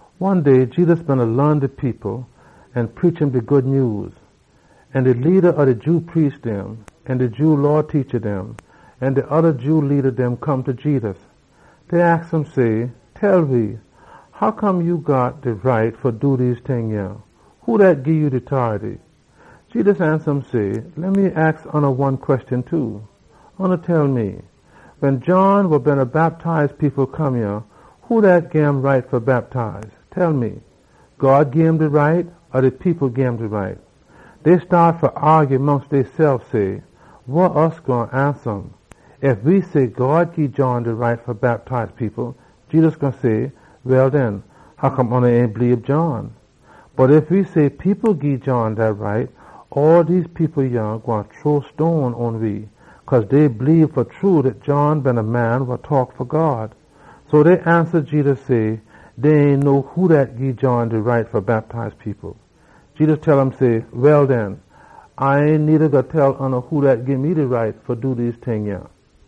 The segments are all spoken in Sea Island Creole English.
One day wiles Jedus beena laan de people an da preach de Good Nyews, de leada dem ob de Jew priest dem, de Jew Law teacha dem an de oda Jew leada dem come ta Jedus. Dey aks um say, “Tell we, wa gii ya de right fa do dem ting yah? Who dat gii ya de tority?” Jedus ansa um say, “Leh me aks oona one queshon too. Oona tell me, wen John wa Bactize people been come yah, who dat gim de right fa bactize. Tell me, God gim de tority, or de people gim de tority?” Dey staat fa aagy mongst deysef say, “Wa we gwine ansa um? Ef we say ‘God gii John de tority fa bactize people,’ e gwine say, ‘Well den, hoccome oona ain bleebe um?’ Bot ef we say ‘People gii John dat tority,’ all dem people yah gwine chunk stone pon we, cause dey bleebe fa true dat John been a prophet.” So dey ansa Jedus, say dey ain know who dat gii John de tority fa bactize people. Jedus tell um say, “Well den, A ain needa gwine tell oona who dat gii me de tority fa do dem ting yah.”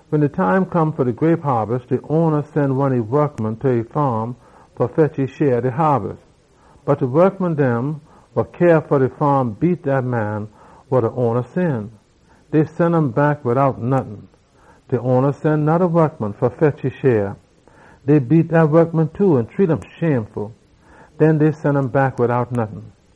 Wen de time come fa de grape haabis, de owna sen a saabant ta e faam fa fetch e share ob de haabis. Bot de wokman dem wa cyah fa e faam beat dat man wa de owna sen. Dey sen um back dout nottin. De owna sen noda saabant fa fetch e share. Dey beat dat man too an shame um. Den dey sen um back wid nottin.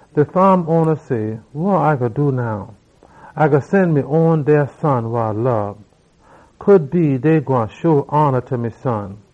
De faam owna say, ‘Wa A gwine do now? A gwine sen me own deah son wa A lob. Dey gwine show hona ta me son.’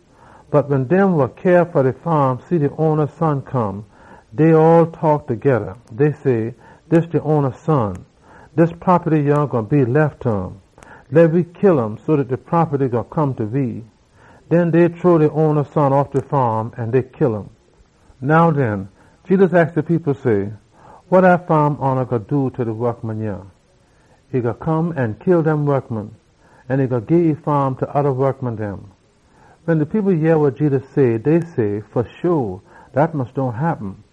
Bot wen dem wa cyah fa de faam see de owna son come, dey all taak togeda say, ‘Dis de owna son. Dis propaty yah gwine be lef ta um. Leh we kill um so dat de propaty gwine come ta we.’ Den dey chunk de owna son off de faam, an dey kill um. “Now den,” Jedus aks de people say, “Wa dat faam owna gwine do ta dem wokman? E gwine come an kill dem, an e gwine gii e faam ta oda wokman dem.” Wen de people yeh wa Jedus say, dey say, “Fa sho, dat mus dohn happen!”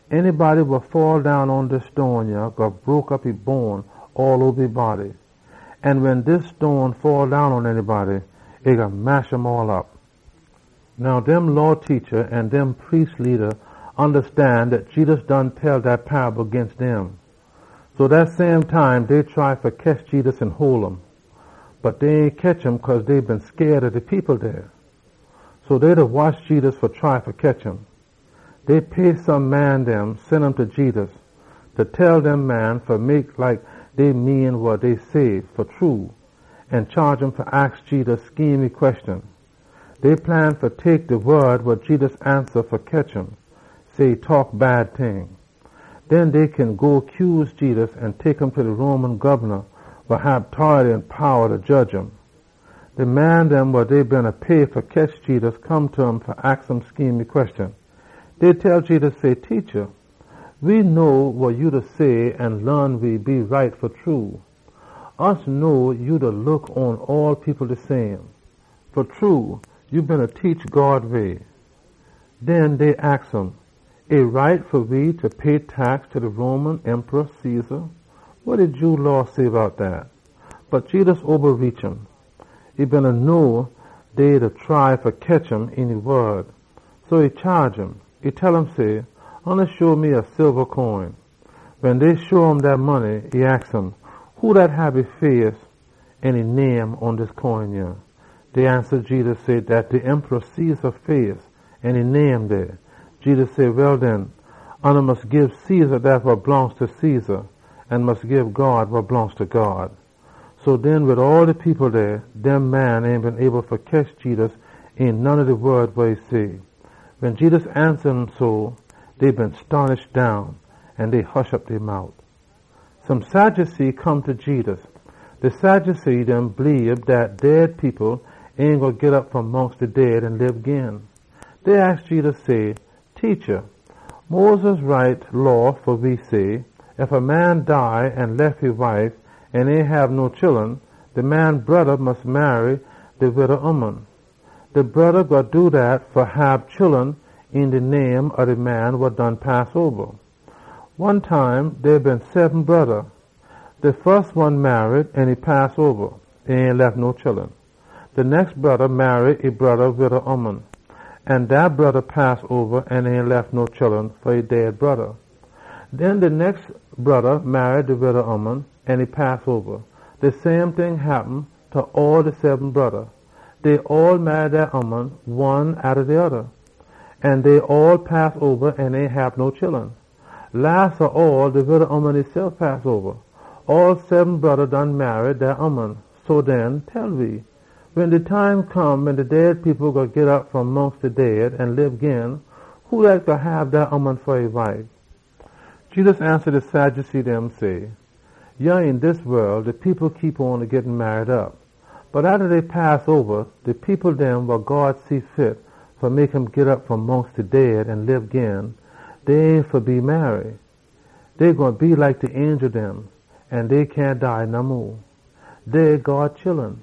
“De poson wa faddown pon dis stone yah gwine broke op all e bone dem. An wen dis stone faddown pon a poson, e gwine mash um all op.” Now, dem Law teacha an dem priest leada ondastan dat Jedus been tell dat paable ginst dem. So dat same time, dey try fa ketch Jedus an hole um. Bot dey ain ketch um cause dey been scaid ob de people dey. So dey beena watch Jedus fa try fa ketch um. Dey pay some man dem, sen um ta Jedus. De tell dem man fa mek like dey mean wa dey say fa true, an chaage um fa aks Jedus schemy queshon. Dey plan fa tek de wod wa Jedus ansa fa ketch um, say e taak bad ting. Den dey kin go cuse Jedus an tek um ta de Roman gobna, wa hab tority an powa fa jedge um. De man dem wa dey beena pay fa ketch Jedus come ta um fa aks um schemy queshon. Dey tell Jedus say, “Teacha, we know wa ya da say an laan we, e right fa true. We know ya da look pon all people de same. Fa true ya da teach God way.” Den dey aks um say, “E right fa we fa pay tax ta de Roman rula Caesar? Wa de Jew Law say bout dat?” Bot Jedus obareach um. E been know dey beena try fa ketch um een e wod. So e chaage um say, “Show me a coin.” Wen dey show um dat money, e aks um say, “Who dat hab e face an e name pon dis coin yah?” Dey ansa Jedus say, “Dat Caesar face an name dey.” Jedus say, “Well den, mus gii Caesar dat wa blongst ta Caesar an gii God wa blongst ta God.” So den wid all de people dey, dem man ain been able fa ketch Jedus een none ob de wod wa e say. Wen Jedus ansa um so, dey been stonish down an dey hush op dey mout. Some Sadducee come ta Jedus. De Sadducee dem bleebe dat dead people ain gwine git op fom mongst de dead an lib gin. Dey aks Jedus say, “Teacha, Moses write law fa we say, ‘Ef a man dead an lef e wife an ain hab no chullun, de man broda mus marry de wida ooman fa hab chullun een de name ob de man wa done pass oba.’ One time dey been seben broda. De fus one marry an e pass oba. E ain lef no chullun. De nex broda marry e broda wida ooman. An dat broda pass oba an ain lef no chullun fa e dead broda. Den de nex broda marry de wida ooman an e pass oba. De same ting happen ta all de seben broda dem. Dey all marry dat ooman, one atta de oda, an dey all pass oba an ain hab no chullun. Las ob all, de wida ooman esef pass oba. All seben broda done marry dat ooman. So den, tell we, wen de time come wen de dead people gwine git op fom mongst de dead an lib gin, who dat gwine hab dat ooman fa e wife?” Jedus ansa de Sadducee dem say, “Yah een dis wol de people da git marry op. Bot atta dey pass oba, de people dem wa God see fit fa mek um git op fom mongst de dead an lib gin, dey ain fa be marry. Dey gwine be like de angel dem, an dey cyahn dead no mo. Dey God chullun,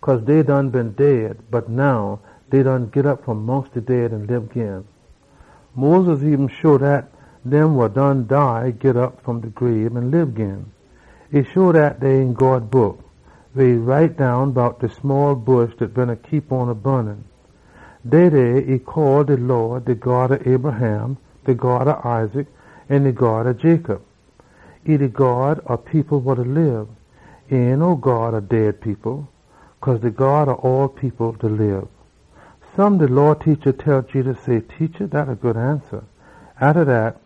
cause dey done been dead bot now dey done git op fom mongst de dead an lib gin. Moses eben show dat dem wa done dead git op fom de grabe an lib gin. E show dat dey een God Book, weh e write down bout de bush dat beena bun. Dey dey e call de Lawd ‘de God ob Abraham, de God ob Isaac, an de God ob Jacob.’ E de God ob dem wa da lib. E ain no God ob dead people. Cause ta God all people da lib.” Some de Law teacha dem tell Jedus say, “Teacha, dat a good ansa!” Atta dat,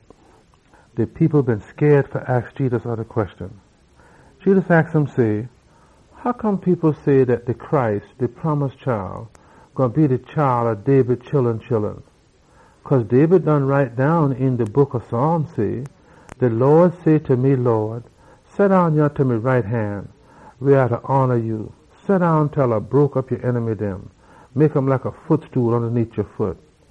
de people been scaid fa aks Jedus oda queshon. Jedus aks um say, “Hoccome people say dat de Messiah gwine be de chile ob David chullun chullun? Cause David done write down een de book ob Psalms say, ‘De Lawd tell me Lawd say, seddown yah ta me right han side til A pit ya enemy dem ondaneet ya foot.’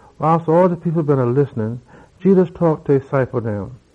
Wiles all de people beena listen, Jedus taak ta e ciple dem.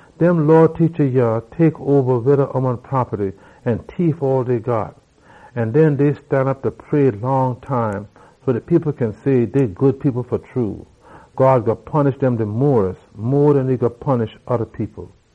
Dem Law teacha yah tek oba wida ooman propaty an tief all dey got. An den dey stanop da pray long time so dat people kin say dey good people fa true! God gwine punish dem mo den e gwine punish oda people.”